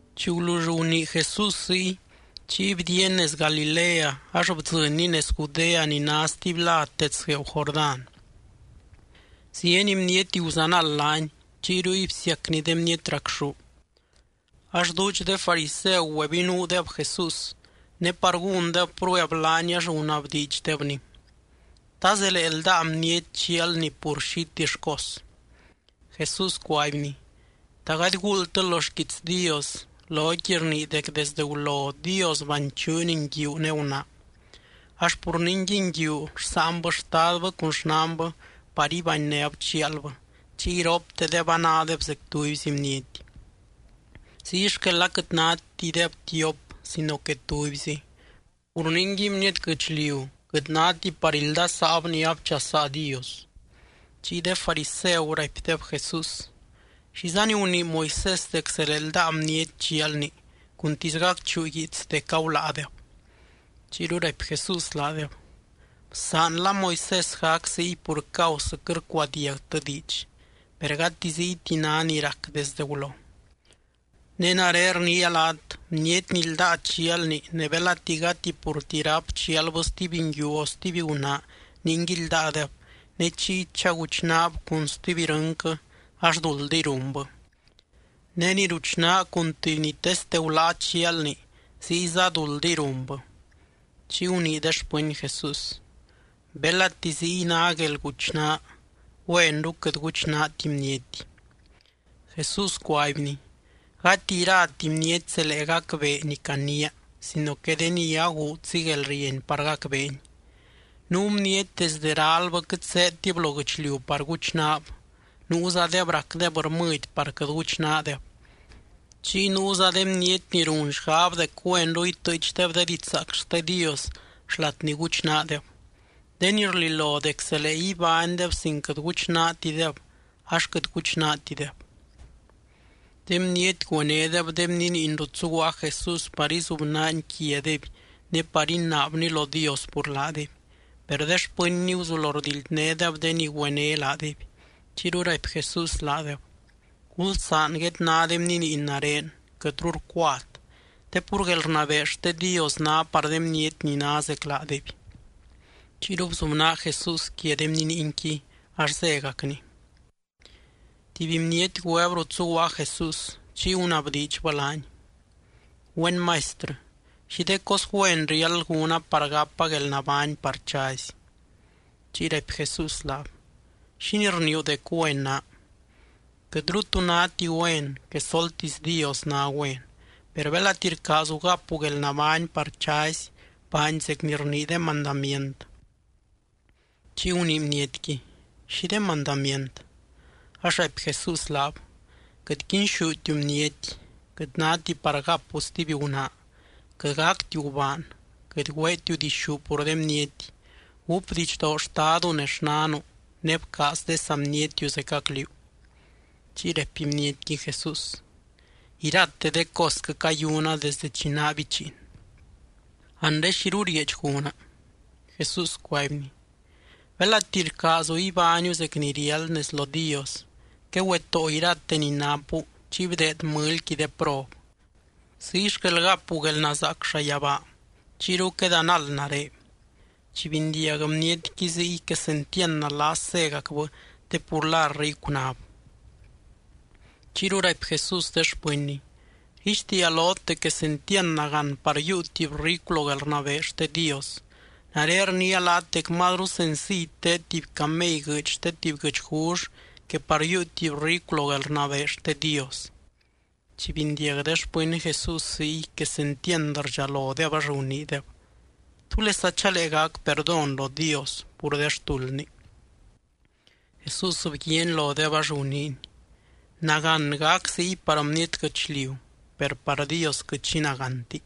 Chi gulull gunii Jesús ziy, chiy bdiiany nez Galilea ax bdzɨnny nez Judea ni ná stuby lad dets gueeu Jordán. Zieny bniety guzanald laany, chiy ruy bsiacny de bniety racxú. Ax duudx de fariseu güebinuudeb Jesús, ne par gúndeb prueb laany ax gunabdiidxdebny: —¿Ta zelee ldáa bniety chialni pur xitill cos? Jesús cuaibny: —¿Ta gady guuldtɨ lo xquiits Dios loqui rnii dec desde gulo Dios “banchuuny nguiu ne gunaa?” Ax: “Pur ningui nguiu rsáanbɨ xtadbɨ cun xnanbɨ par ibanynéb chialbɨ, chiy iroptedeb anádeb zec tubyzi bniety.” Ziy xquel aquɨt nátideb tiop sino que tubyzi. Pur ningui, bniety guɨchliu quɨt náti par ildasaab ni abchasaa Dios. Chiy de fariseu raipdeb Jesús: —¿Xizani gunii Moisés dec zelee ldáa bniety chialni, cuntisy gacchuu guiits dec aguláadeb? Chiyru raipy Jesús laadeb: —Bsaanla Moisés gac ziy pur causɨ quɨt rcuadiagtɨ diidx, per gati ziyti ná ni rac desdɨ gulo. Ne nare rniia laat, bniety ni ldáa chialni ne belati gati purti ráp chialbɨ stuby nguiu o stuby gunaa ningui ldáadeb, ne chiy chaguchnaab cun stuby irɨnquɨ ax duldiy runbɨ. Ne ni ruchnaa cun tuby ni teste guláa chialni, ziyza duldiy runbɨ. Chiy gunii de xpɨny Jesús: —Belati ziy ná guelguchnaa, güenru quɨt guchnaati bniety. Jesús cuaibny: —Gati irati bniety zelee gacbee ni caniia, sino que de ni aguudzi guelrieny par gacbeeni. Nuu bniety desde ralbɨ quɨt zéedtib lo guɨchliu par guchnaab, nuuzadeb racdeb rmɨdy par quɨt guchnaadeb, chiy nuuza de bniety ni run xgab dec güenru itɨɨchdeb de didxzaac xte Dios xlat ni guchnaadeb. De ni rlilo dec zelee ibánydeb sin quɨt guchnaatideb, ax quɨt guchnaatideb. De bniety güenédeb de bniniin rut zuguaa Jesús par izubnaany quiadeby ne par inaabny lo Dios pur laadeby. Per de xpɨnny guzulo rdildnédeb de ni güené laadeby. Chiyru raipy Jesús laadeb: —Gulsaan guedná de bniniin nare, quɨtru rcuat. Te pur guelrnabee xte Dios ná par de bniety ni ná zec laadeby. Chiyru bzubnaa Jesús quia de bniniinqui, ax zégacny. Tuby bniety güeb rut zuguaa Jesús, chiy gunabdiidxbɨ laany: —Güen Maistrɨ, ¿xi de cos güen riáld gúna par gapa guelnabány par chazy? Chiy raipy Jesús laab: —¿Xínii rniiu dec güen naa? Quɨtru tu náti güen, quesoltisy Dios ná güen. Per belati rcaazu gapu guelnabány par chazy, baany zec ni rnii de mandamient. Chiy gunii bnietqui: —¿Xi de mandamient? Ax raipy Jesús laab: —Quɨt quinxútiu bniety. Quɨt náti par gapu stuby gunaa. Quɨt gactiu gubaan. Quɨt güeetiu dixú pur de bniety. Gúp didxdoo xtadu ne xnanu, ne bcaaz de saa bnietiu zecac liú. Chiy raipy bnietqui Jesús: —Irate de cosquɨ cayuna desdɨ chi naa bichiin. Anre, ¿xiru rieedx gúna? Jesús cuaibny: —Belati rcaazu ibániu zec ni riáld nez lo Dios, quegüetóo irate ni napu chiy bdeed mɨlyqui de prob. Ziy xquel gapu guelnazaac llayabaa. Chiyru quedanald nare. Chi bindiag bnietqui ziy, quesentiand nalas zégacbɨ te pur la ricu náb. Chiyru raipy Jesús de xpɨnny: —Rguixtiia lot dec quesentiand nagán par yiiu tuby ricu lo guelrnabee xte Dios. Nare rniia laat dec mazru senciy teed tuby camey guɨɨdy xte tuby guɨchgull, que par yiiu tuby ricu lo guelrnabee xte Dios. Chi bindiag de xpɨny Jesús ziy, quesentiand rdxalodeb, ax guniideb: —¿Túlesa chalee gac perdón lo Dios pur de xtuldni? Jesús bguiaany lodeb ax guniiny: —Nagán gac ziy par bniety guɨchliu, per par Dios quɨt xi nagánti.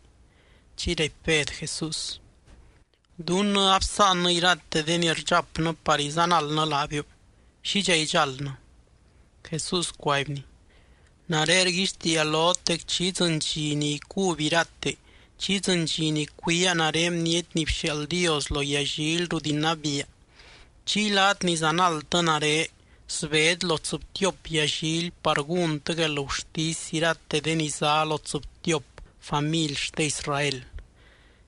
Chiy raipy Bed Jesús: —Dunnɨ absáannɨ irate de ni rdxapnɨ par izanaldnɨ laabiu. ¿Xidxa idxáldnɨ? Jesús cuaibny: —Nare rguixtiia lot dec chi idzɨny dxi ni icuby irate, chi idzɨny dxi ni cuiaa nare Bniety ni bxiaald Dios lo yallily rut inabiia, chiy laat ni zanaldtɨ nare sbet lo tsɨbtiop yallily par gúntɨ guelgurtisy irate de ni zá lo tsɨbtiop family xte Israel.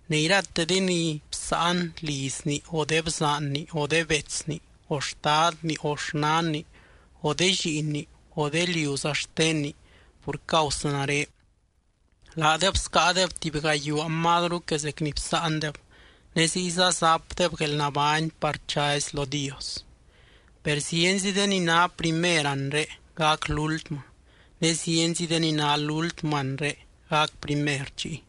Ne irate de ni bsáan lizni, o de bzaanni, o de betsni, o xtadni, o xnanni, o de lliinni, o de liuza xtenni pur causɨ nare, laadeb scáadeb tuby gayuaa mazru que zec ni bsáandeb, ne ziyza zapdeb guelnabány par chazy lo Dios. Per zienzi de ni ná primer anre, gac lúltmɨ, ne zienzi de ni ná lúltmɨ anre, gac primer chiy.